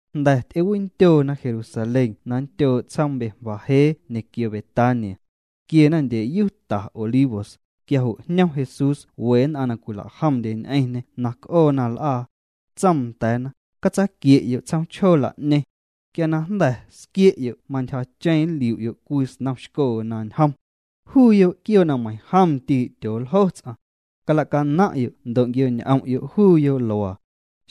Jnda̱ ty'ewindyoona Jerusalén na nndyoo' tsjoom Betfagé ñequio Betania. Tquiena ndyeyu ta Olivos, quia jo' jñom Jesús we nn'aⁿ na cwila'jomndye ñ'eⁿñê na c'oona l'aa. Tsoom nda̱a̱na: —Catsaaquie'yo' tsjoom chjoo la'ñeⁿ. Quia na jnda̱ squie'yo' mantyjacheⁿ nliu'yo' cwii snom xcoo na ñjom. Juuyo' quioo' na meiⁿjom ndii' tyooljo ts'aⁿ. Cala'naⁿ'yo' ndo' quio'ñ'om'yo' juuyo' luaa.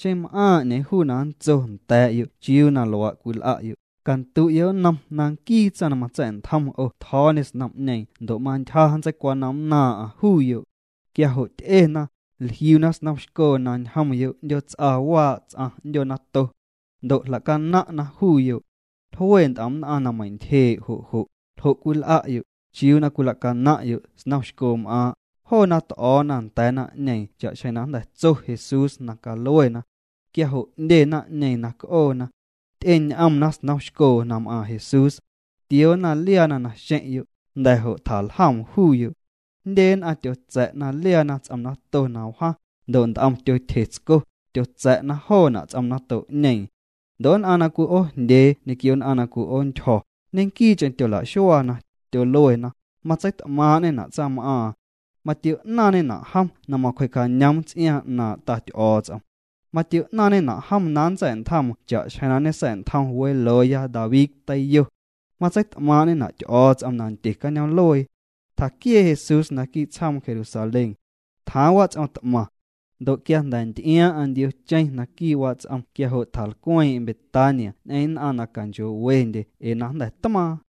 Xeⁿ m'aaⁿ 'ñeeⁿ juu na nntso nda̱a̱'yo' chiuu na luaa' cwil'a'yo', candu'yo' nnom na nquii tsaⁿ na matsa̱'ntjom 'o tjo̱o̱ñê snom'ñeeⁿ ndo' mantyja nntseicwanomnnaaⁿ'aⁿ juuyo'. Quia jo' ty'ena, jliuna snom xcoo na ñjomyo' 'ndyoots'a waa' ts'aⁿ 'ndyoo nato. Ndo' jlacanaⁿ'na juuyo'. Jlue nt'om nn'aⁿ na meintyjee' jo' jo': —¿Ljo' cwil'a'yo'? ¿Chiuu na cwilacanaⁿ'yo' snom xcoom'aaⁿ'? Joona t'o̱o̱na nda̱a̱ naⁿ'ñeeⁿ cha'xjeⁿ na jnda̱ tso Jesús na caluena. Quia jo' 'ndye naⁿ'ñeeⁿ na c'oona. Ty'eñ'omna snom xcoo na m'aaⁿ Jesús. Tioona liaana naxeⁿ'yo', jnda̱ jo' tjaljoom juuyo'. Jndye nn'aⁿ tyotsa̱'na liaana ts'om nato na wjaⁿ, ndo' nt'om tyotyje tsco, tyotsa̱' joona' ts'om nato'ñeeⁿ. Ndo' nn'aⁿ na cwi'oojndyee ñequio nn'aⁿ na cwi'oontyjo̱, ñequii'cheⁿ tyola'xuaana, tyoluena: —Matseit'maaⁿ'ñena' tsaⁿm'aaⁿ. Matio'naaⁿñena' jom na macwjee'cañoom ts'iaaⁿ 'naaⁿ' Ta Ty'o̱o̱ts'om. Matio'naaⁿñena' jom na nntsa̱'ntjoom cha'xjeⁿ na ñesa̱'ntjom welooya David tiyo. Matseit'maaⁿ'ñena' Ty'o̱o̱ts'om nandye cañoom'luee. Tjaquiee' Jesús naquii' tsjoom Jerusalén. Tjaaⁿ wats'om t'maⁿ. Ndo' quia jnda̱ nty'iaaⁿ'aⁿ ndiocheⁿ naquii' wats'om quia jo' tjalcweeⁿ'eⁿ Betania ñ'eⁿ nn'aⁿ na canchoo'wendye ee na jnda̱ tmaaⁿ.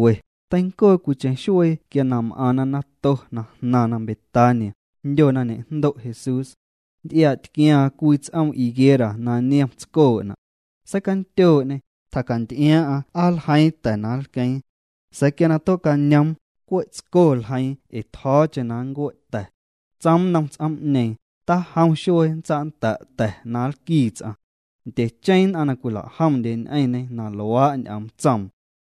Teincoo cwiicheⁿ xuee quia na m'aⁿna nato na jnaⁿna Betania, jndyo na ñe'jndo' Jesús. Nty'iaa'tquiaaⁿ cwii ts'oom higuera na niom tscoo'na'. Seicandyoo'ñê, tjacanty'iaaⁿ'aⁿ aa nljeiiⁿ ta̱ na nlqueeⁿ. Sa̱a̱ quia na tue'cañoom, cwe' tsco ljeiiⁿ ee tjo̱o̱cheⁿ na nncue' ta̱. Tsoom nnom ts'oom'ñeeⁿ: —Tajom xuee nntsa'nnda' ta̱ na nlquii ts'aⁿ. Ndyecheⁿ nn'aⁿ na cwila'jomndye ñ'eⁿñê na luaa' ñ'oom tsoom.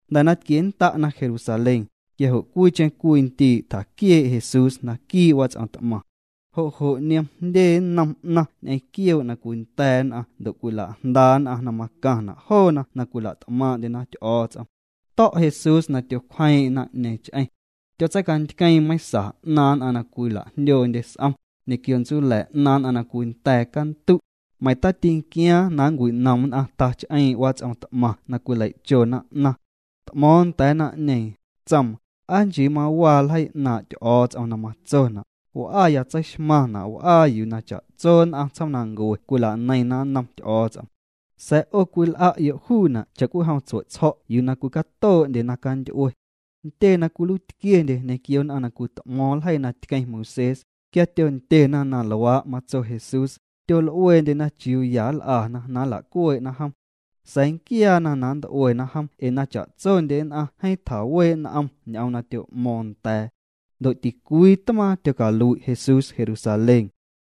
Jnda̱ na tquiennda'na Jerusalén, quia jo' cwiicheⁿ cwii ndii' tjaquiee' Jesús naquii' wats'om t'maⁿ. Jo' jo' niom jndye nnom 'naⁿ ñ'eⁿ quioo' na cwinda̱a̱ nn'aⁿ ndo' cwila'jnda nn'aⁿ na macaⁿna' joona na cwila't'maaⁿ'ndyena Ty'o̱o̱ts'om. To̱' Jesús na tyocwjeeⁿ'eⁿ naⁿ'ñeeⁿ ch'eⁿ. Tyotseicantqueeⁿ meiⁿsa 'naaⁿ nn'aⁿ na cwila'jndyoondye s'om, ñequio ntsula̱ 'naaⁿ nn'aⁿ na cwinda̱a̱ cantu'. Meiⁿ tatinquiaaⁿ na nncwinom nn'aⁿ tach'eeⁿ' wats'om t'maⁿ na cwilei'chona 'naⁿ. T'mo̱o̱ⁿ nda̱a̱ naⁿ'ñeeⁿ, tsoom: —Aa nchii mawaa ljeii 'naaⁿ' Ty'o̱o̱ts'om na matsona': “W'aya tseixmaⁿna' w'aa yuu cha'tso nn'aⁿ tsjoomnancue cwila'neiⁿna nnom Ty'o̱o̱ts'om.” Sa̱a̱ 'o cwil'a'yo' juuna' cha'cwijom tsue'tsjo̱' yuu na cwicatoo'ndye naⁿcanty'ue. Ntyee na cwiluiitquiendye ñequio nn'aⁿ na cwit'mo̱o̱ⁿ ljeii na tqueⁿ Moisés, quia tyondyena na luaa' matso Jesús, tyol'ueendyena chiuu ya nl'ana na nla'cuee'na jom. Sa̱a̱ nquiaana na nnt'uena jom ee na cha'tsondye nn'aⁿ jeeⁿ tjawee' n'om ñ'oom na tyo'mo̱o̱ⁿ nda̱a̱. Ndo' ticwii tmaaⁿ tyocalui' Jesús Jerusalén.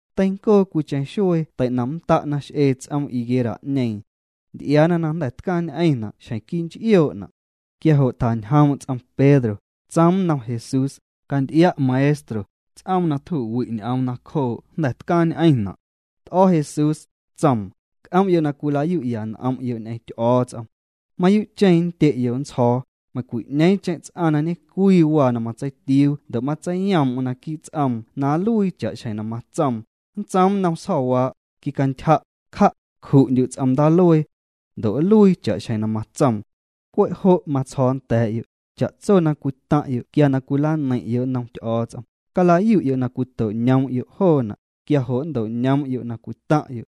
Teincoo cwiicheⁿ xuee tei'nomnnda'na x'ee ts'oom higuera'ñeeⁿ. Nty'iaana na jnda̱ tcaaⁿñ'eⁿna' xjeⁿ quii' nch'ioo'na'. Quia jo' tjañjoom' ts'om Pedro, tsoom nnom Jesús: —Canty'ia' Maestro, ts'oom na tju'wi' ñ'oom nacjoo' jnda̱ tcaaⁿñ'eⁿna'. T'o̱ Jesús, tsoom: —C'om'yo' na cwilayu'ya n'om'yo' ñ'eⁿ Ty'o̱o̱ts'om. Mayuu'cheⁿ nndye'yo' nntsjo̱o̱, meiⁿcwi'ñeeⁿcheⁿ ts'aⁿ na ñe'cwii waa na matseitiuu ndo' matseiyoom'm naquii' ts'oom na nluii cha'xjeⁿ na matsoom, nntsoom nnom sjo̱waa': “Quicantyja', cja', cju'ndyu' ts'om ndaaluee.” Ndo' nluii cha'xjeⁿ na matsoom. Cwe' jo' matsjo̱o̱ nda̱a̱'yo', cha'tso na cwitaⁿ'yo' quia na cwilaneiⁿ'yo' nnom Ty'o̱o̱ts'om, calayu'yo' na cwito'ñoom'yo' joona', quia jo' nnto'ñoom'yo' na cwitaⁿ'yo'.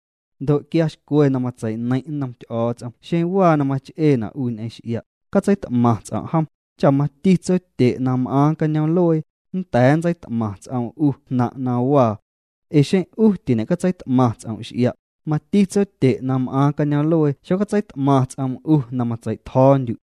Ndo' quia xcwe na matsei'neiⁿ' nnom Ty'o̱o̱ts'om xeⁿ waa na mach'eena' 'u ñ'eⁿ x'ia', catseit'maⁿ ts'om' jom, cha mati Tsotye' na m'aaⁿ cañoom'luee, nnda̱a̱ nntseit'maⁿ ts'oom 'u jnaⁿ' na waa. Ee xeⁿ 'u tiñe'catseit'maⁿ ts'om' x'ia', mati Tsotye' na m'aaⁿ cañoom'luee xocatseit'maⁿ ts'oom 'u juu na matsei'tjo̱o̱ndyu'.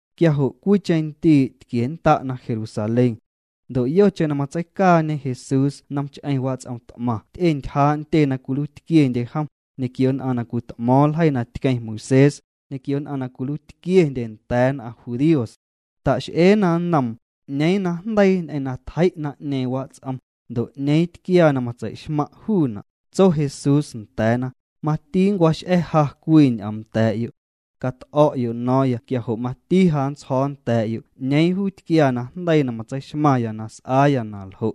Quia jo' cwiicheⁿ ndii' tquiennda'na Jerusalén. Ndo' yocheⁿ na matseicaañe Jesús nomch'eⁿ wats'om t'maⁿ ty'entyjaa' ntyee na cwiluiitquiendye jom, ñequio nn'aⁿ na cwit'mo̱o̱ⁿ ljeii na tqueⁿ Moisés, ñequio nn'aⁿ na cwiluiitquiendye nda̱a̱ nn'aⁿ judíos. Ta'x'eena nnoom: —¿'Ñeeⁿ najndeii ñ'eⁿ na tjei' naⁿ'ñeeⁿ wats'om? Ndo' ¿'ñeeⁿ tquiaa na matsei'xmaⁿ' juuna'? Tso Jesús nda̱a̱na: —Mati nncwax'a̱ ja cwii ñ'oom nda̱a̱'yo'. Cat'o̱'yo' no̱o̱ⁿya quia jo' mati ja nntsjo̱o̱ nda̱a̱'yo' 'ñeeⁿ juu tquiaa najndeii na matseixmaⁿya na s'aaya na ljo'.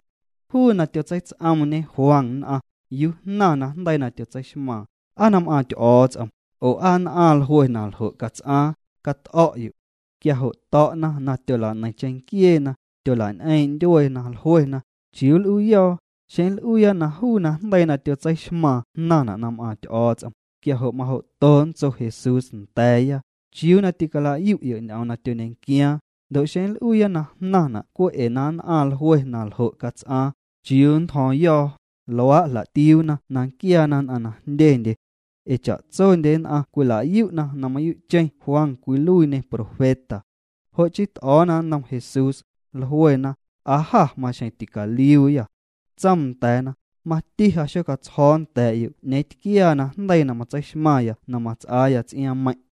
Juu na tyotseits'oomñe Juan nn'aⁿ, ¿yuu jnaⁿ najndeii na tyotseixmaaⁿ? ¿Aa na m'aaⁿ Ty'o̱o̱ts'om? oo ¿aa nn'aⁿ jlue na ljo' cats'aaⁿ? Cat'o̱'yo'. Quia jo' to̱'na na tyola'neiⁿ cheⁿnquieena, tyola'ñ'eeⁿ' ndyueena. Jluena: —¿Chiuu l'uuyo̱o̱? Xeⁿ nl'uuya juu najndeii na tyotseixmaaⁿ jnaⁿna' na m'aaⁿ Ty'o̱o̱ts'om, quia jo' majo'to nntso Jesús nda̱a̱ya: “¿Chiuu na ticalayu'yo' ñ'oom na tyoñequiaaⁿ?” Ndo' xeⁿ nl'uuya na jnaⁿna' cwe' ee na nn'aⁿ jlue na ljo' cats'aaⁿ, ¿chiuu nntjo̱o̱ⁿyo̱o̱? Luaa' jla'tiuuna na nquiaana nn'aⁿ na jndyendye. Ee cha'tsondye nn'aⁿ cwila'yu' na mayuu'cheⁿ Juan cwiluiiñê profeta. Jo' chii t'o̱o̱na nnom Jesús, jluena: —Aa jâ maxjeⁿ ticaliuuyâ. Tsoom nda̱a̱na: —Mati ja xocatsjo̱o̱ nda̱a̱'yo' 'ñeeⁿ tquiaa najndeii na matseixmaⁿya na mats'aa ts'iaaⁿmeiⁿ'.